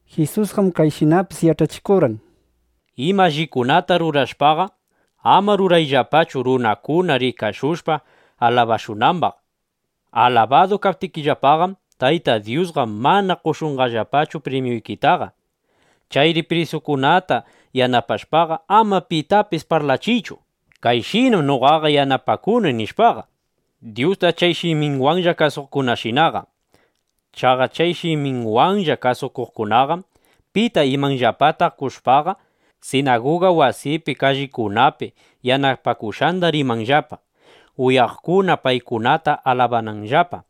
Jisusqam kayshinapis yach'achikurqan: —Ima allikunata rurashpaqa, ama rurayllapachu, runakuna rikashushpa alabashunambaq. Alabadu kaptikillapaqam, Tayta Dyusqa mana qoshunqallapachu primyuykitaqa. Chayri pubrisitukunata yanapashpaqa, ama pitapis parlachiychu: “Kayshinam noqaqa yanapakuni”, nishpaqa, Dyusta chay shiminwanlla kasuqkunashinaqa. Chaqa chay shiminwanlla kasukuqkunaqam pita imanllapata qoshpaqa, sinaguga wasipi, kallikunapi yanapakushqanda rimanllapa, uyaqkuna paykunata alabananllapa.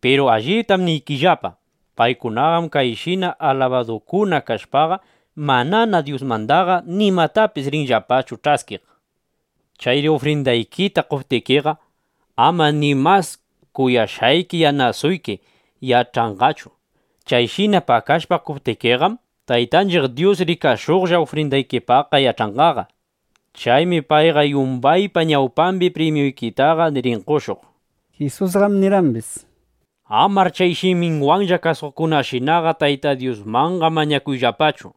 Piru alliptam niykillapa, paykunaqam chayshina alabadukuna kashpaqa, manana Dyusmandaqa nimatapis rinllapachu ch'askiq. Chayri ufrindaykita qoptikiqa, ama ni mas kuyashqayki yanasuyki (yanasayki) yach'anqachu. Chayshina pakashpa qoptikiqam, Taytanchiq Dyus rikashuqlla ufrindaykipaqqa yach'anqaqa. Chaymi payqa yumbaypa ñawpambi primyuykitaqa rin qoshuq. Jisusqam nirqambis: —Amar chay shiminwanlla kasukuqshinaqa Tayta Dyusmanqa mañakuyllapachu.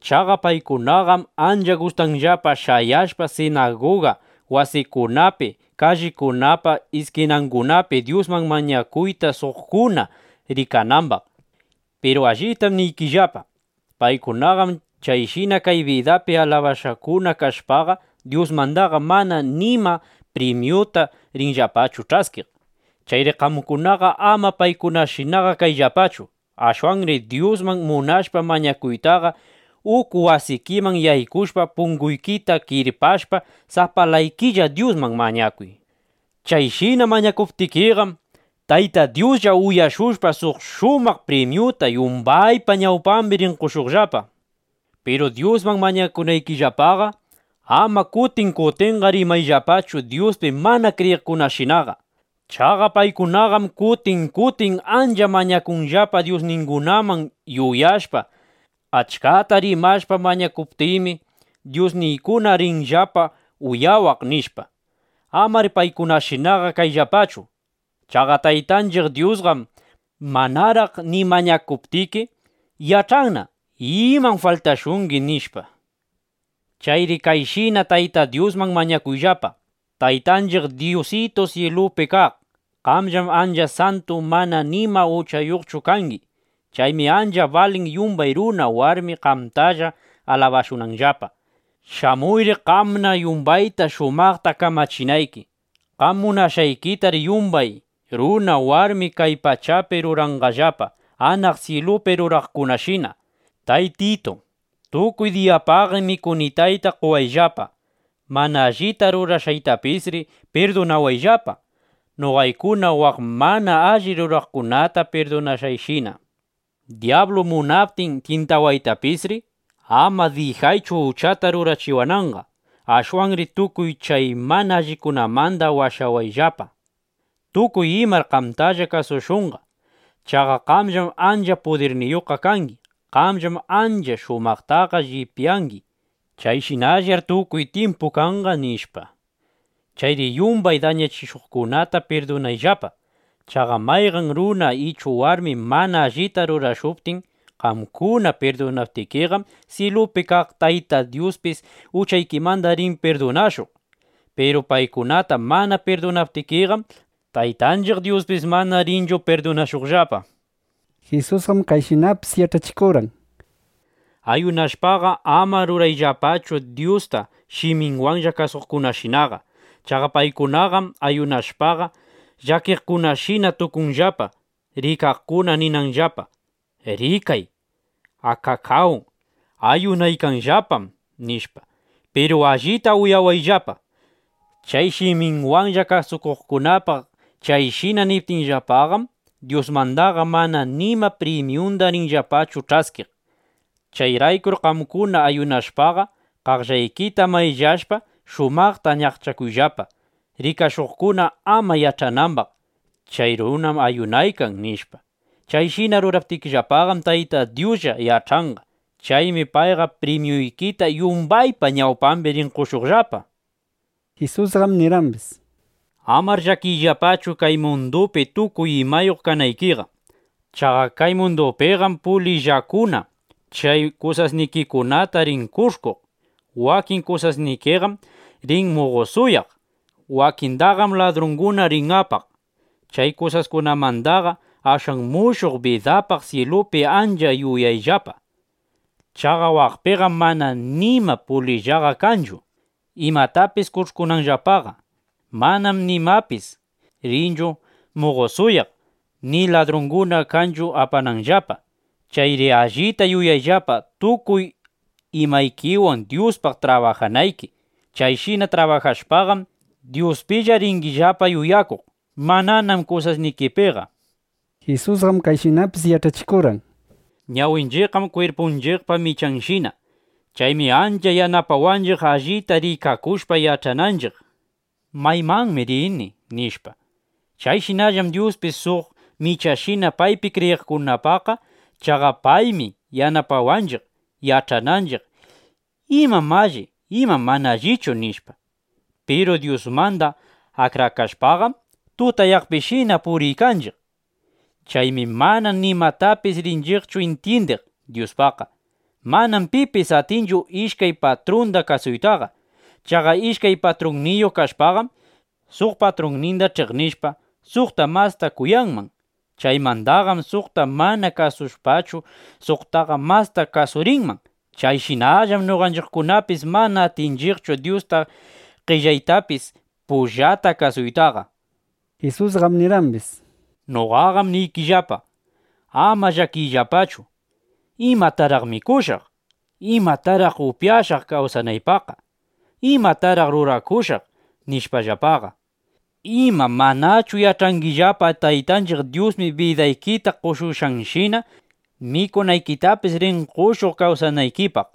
Chaqa paykunaqam ancha gustanllapa shayashpa sinaguga wasikunapi, kallikunapa iskinangunapi Dyusman mañakuyta, suqkuna rikanambaq. Piru alliptam niykillapa, paykunaqam chayshina kay bidapi alabashqakuna kashpaqa, Dyusmandaqa mana nima primyuta rinllapachu ch'askiq. Chayri qamkunaqa ama paykunashinaqa kayllapachu. Ashwanri Dyusman munashpa mañakuytaqa, uku wasikiman yaykushpa, punguykita kirpashpa, sapalaykilla Dyusman mañakuy. Chayshina mañakuptikiqam, Tayta Dyuslla uyashushpa, suq shumaq primyuta ˻yumbaypa ñawpambi˼ rin qoshuqllapa. ’Piru Dyusman mañakunaykillapaqa, ama kutin kutinqa rimayllapachu Dyuspi mana kriyiqkunashinaqa. Chaqa paykunaqam kutin kutin ancha mañakunllapa dyusningunaman, yuyashpa: Achkata rimashpa mañakuptiymi, dyusniykuna rinllapa uyawaq, nishpa. Amar paykunashinaqa kayllapachu. Chaqa Taytanchiq Dyusqam manaraq ni mañakuptiki, yach'anna imam faltashungi, nishpa. Chayri kayshina Tayta Dyusman mañakuyllapa: Taytanchiq Dyusitu syilupi kaq, qamllam ancha santu, mana nima uchayuqchu kangi. Chaymi ancha balin, yumbay runa, warmi qamtalla alabashunanllapa. Shamuyri, qamna yumbayta shumaqta kamachinayki. Qam munashqaykitar yumbay runa warmi kay pachapi ruranqallapa, anaq syilupi ruraqkunashina. Taytitu, tukuy diyapaqri mikunitayta qowayllapa. Mana allita rurashqaytapisri pirdunawayllapa, noqaykuna waq mana alli rurawaqkunata pirdunashqayshina. Dyablu munaptin tyintawaytapisri, ama dijaychu uchata rurachiwananqa. Ashwanri tukuy chay mana allikunamanda washawayllapa. ˻Tukuy imar qamtalla kasushunqa. Chaqa qamllam ancha pudirniyuqqa kangi. Qamllam ancha shumaqtaqa llipyangi. Chayshinallar tukuy tyimpu kanqa,˼ nishpa. ’Chayri yumbay dañachishuqkunata pirdunayllapa. Chaqa mayqan runa ichu warmi mana allita rurashuptin, qamkuna pirdunaptikiqam, syilupi kaq Tayta Dyuspis uchaykimanda rin pirdunashuq. Piru paykunata mana pirdunaptikiqam, Taytanchiq Dyuspis mana rinchu pirdunashuqllapa. Jisusqam kayshinapis yach'achikurqan: —Ayunashpaqa, ama rurayllapachu Dyusta shiminwanlla kasuqkunashinaqa. Chaqa paykunaqam ayunashpaqa, llakiqkunashina tukunllapa, rikaqkuna ninanllapa: “Rikay, akakáw, ayunaykanllapam”, nishpa. Piru allita uyawayllapa: chay shiminwanlla kasukuqkunapaq chayshina niptinllapaqam, Dyusmandaqa mana nima primyunda rinllapachu ch'askiq. Chayraykur qamkuna ayunashpaqa, qaqllaykita mayllashpa, shumaqta ñaqchakuyllapa, rikashuqkuna ama yach'anambaq: Chay runam ayunaykan, nishpa. Chayshina ruraptikillapaqam, Tayta Dyuslla yach'anqa. Chaymi payqa primyuykita ˻yumbaypa ñawpambi˼ rin qoshuq. Jisusqam nirqambis: —Amar llakiyllapachu, kay mundupi tukuy imayuq kanaykiqa. Chaqa kay mundupiqam pulillakuna chay kusasnikikunata rin kush'kuq. Wakin kusasnikiqam rin muqosuyaq. Wakindaqam ladrunguna rin apaq. Chay kusaskunamandaqa ashwan mushuq bidapaq syilupi ancha yuyayllapa. Chaqa waqpiqam mana nima pulillaqa kanchu, imatapis kush'kunanllapaqa. Manam nimapis rinchu muqosuyaq, ni ladrunguna kanchu apananllapaqa. Chayri allita yuyayllapa, tukuy imaykiwan Dyuspaq trabajanayki. Chayshina trabajashpaqam, Dyuspilla ringillapa yuyakuq; mananam kusasnikipiqa. Jisusqam kayshinapis yach'achikurqan: —Ñawinchiqqam kwirpunchiqpa michanshina. Chaymi ancha yanapawanchiq allita rikakushpa, yach'ananchiq: ¿Maymanmi rini? nishpa. Chayshinallam Dyuspis suq michashina paypi kriyiqkunapaqqa. Chaqa paymi yanapawanchiq, yach'ananchiq: ¿Imam alli? ¿Imam mana allichu? nishpa. Piru Dyusmanda akrakashpaqam, tutayaqpishina puriykanchiq. Chaymi mana nimatapis rinchiqchu intyindiq Dyuspaqqa. ’Manam pipis atinchu ishkay patrunda kasuytaqa. Chaqa ishkay patrunniyuq kashpaqam, suq patrunninda ch'iqnishpa, suqta masta kuyanman. Chaymandaqam suqta manana kasushpachu, suqtana masta kasurinman. Chayshinallam noqanchiqkunapis mana atinchiqchu Dyusta qellaytapis pullata kasuytaqa. Jisusqam nirqambis: —Noqaqam niykillapa, ama llakiyllapachu: ¿Imataraq mikushaq? ¿Imataraq upyashaq kawsanaypaqqa? ¿Imataraq rurakushaq? nishpallapaqa. Ima, ¿manachu yach'angillapa, Taytanchiq Dyusmi bidaykita qoshushqanshina, mikunaykitapis rin qoshuq kawsanaykipaq,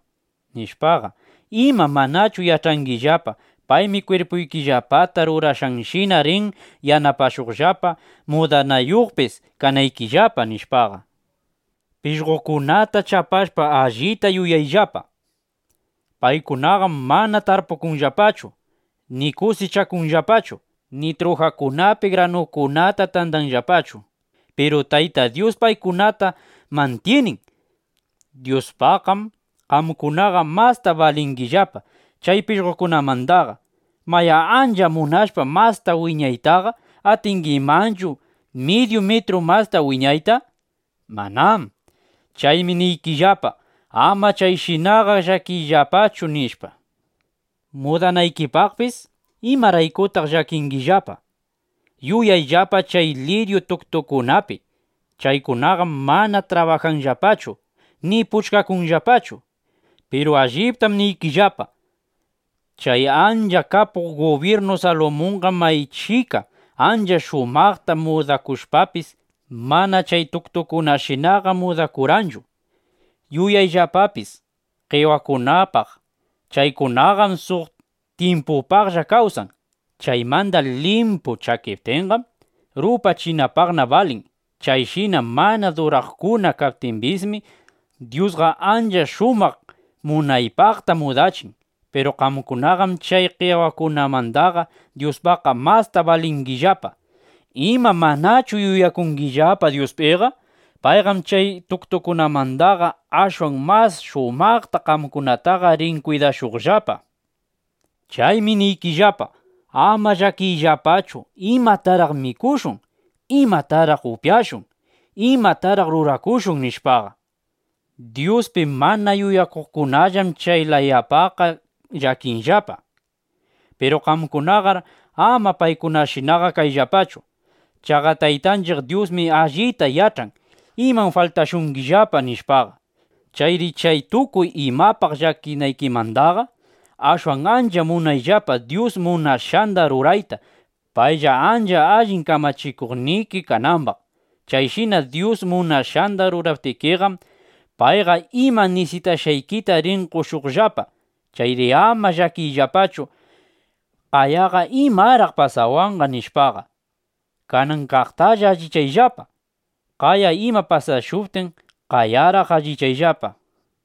nishpaqa? Ima ¿manachu yach'angillapa, paymi kwirpuykillapata rurashqanshina rin yanapashuqllapa mudanayuqpis kanaykillapa, nishpaqa? Pishqokunata chapashpa, allita yuyayllapa: Paykunaqam mana tarpukunllapachu, ni kusichakunllapachu, ni trujakunapi granukunata tandanllapachu. Piru Tayta Dyus paykunata mantyinin. Dyuspaqqam qamkunaqa masta balingillapa chay pishqokunamandaqa. Mayá, ancha munashpa masta wiñaytaqa, ¿atingimanchu midyu mitru masta wiñayta? Manám. Chaymi niykillapa, ama chayshinaqa llakiyllapachu, nishpa. ’Mudanaykipaqpis ¿imaraykutaq llakingillapaqa? Yuyayllapa chay liryu tuktukunapi. Chaykunaqam mana trabajanllapachu, ni puchkakunllapachu. Piru alliptam niykillapa, chay ancha kapuq gubyirnu Salumunqam maychika ancha shumaqta mudakushpapis, mana chay tuktukunashinaqa mudakurqanchu. Yuyayllapapis qewakunapaq. Chaykunaqam suq tyimpupaqlla kawsan. Chaymanda limpu chakiptinqam, rupachinapaqna balin. Chayshina mana duraqkuna kaptimbismi, Dyusqa ancha shumaq munaypaqta mudachin. Piru qamkunaqam chay qewakunamandaqa Dyuspaqqa masta balingillapa. ¿Ima manachu yuyakungillapa Dyuspiqa? Payqam chay tuktukunamandaqa ashwan mas shumaqta qamkunataqa rin kwidashuqllapa. Chaymi niykillapa, ama llakiyllapachu: ¿Imataraq mikushun? ¿Imataraq upyashun? ¿Imataraq rurakushun? nishpaqa. Dyuspi mana yuyakuqkunallam chay layapaqqa llakinllapa. Piru qamkunaqar ama paykunashinaqa kayllapachu. Chaqa Taytanchiq Dyusmi allita yach'an imam faltashungillapa, nishpaqa. Chayri chay tukuy imapaq llakinaykimandaqa, ashwan ancha munayllapa Dyus munashqanda rurayta, paylla ancha allin kamachikuqniki kanambaq. Chayshina Dyus munashqanda ruraptikiqam, payqa ima nisitashqaykita rin qoshuqllapa. Chayri ama llakiyllapachu: ¿Qayaqa imaraq pasawanqa? nishpaqa. Kanan kaqtalla allichayllapa. Qaya ima pasashuptin, qayaraq allichayllapa.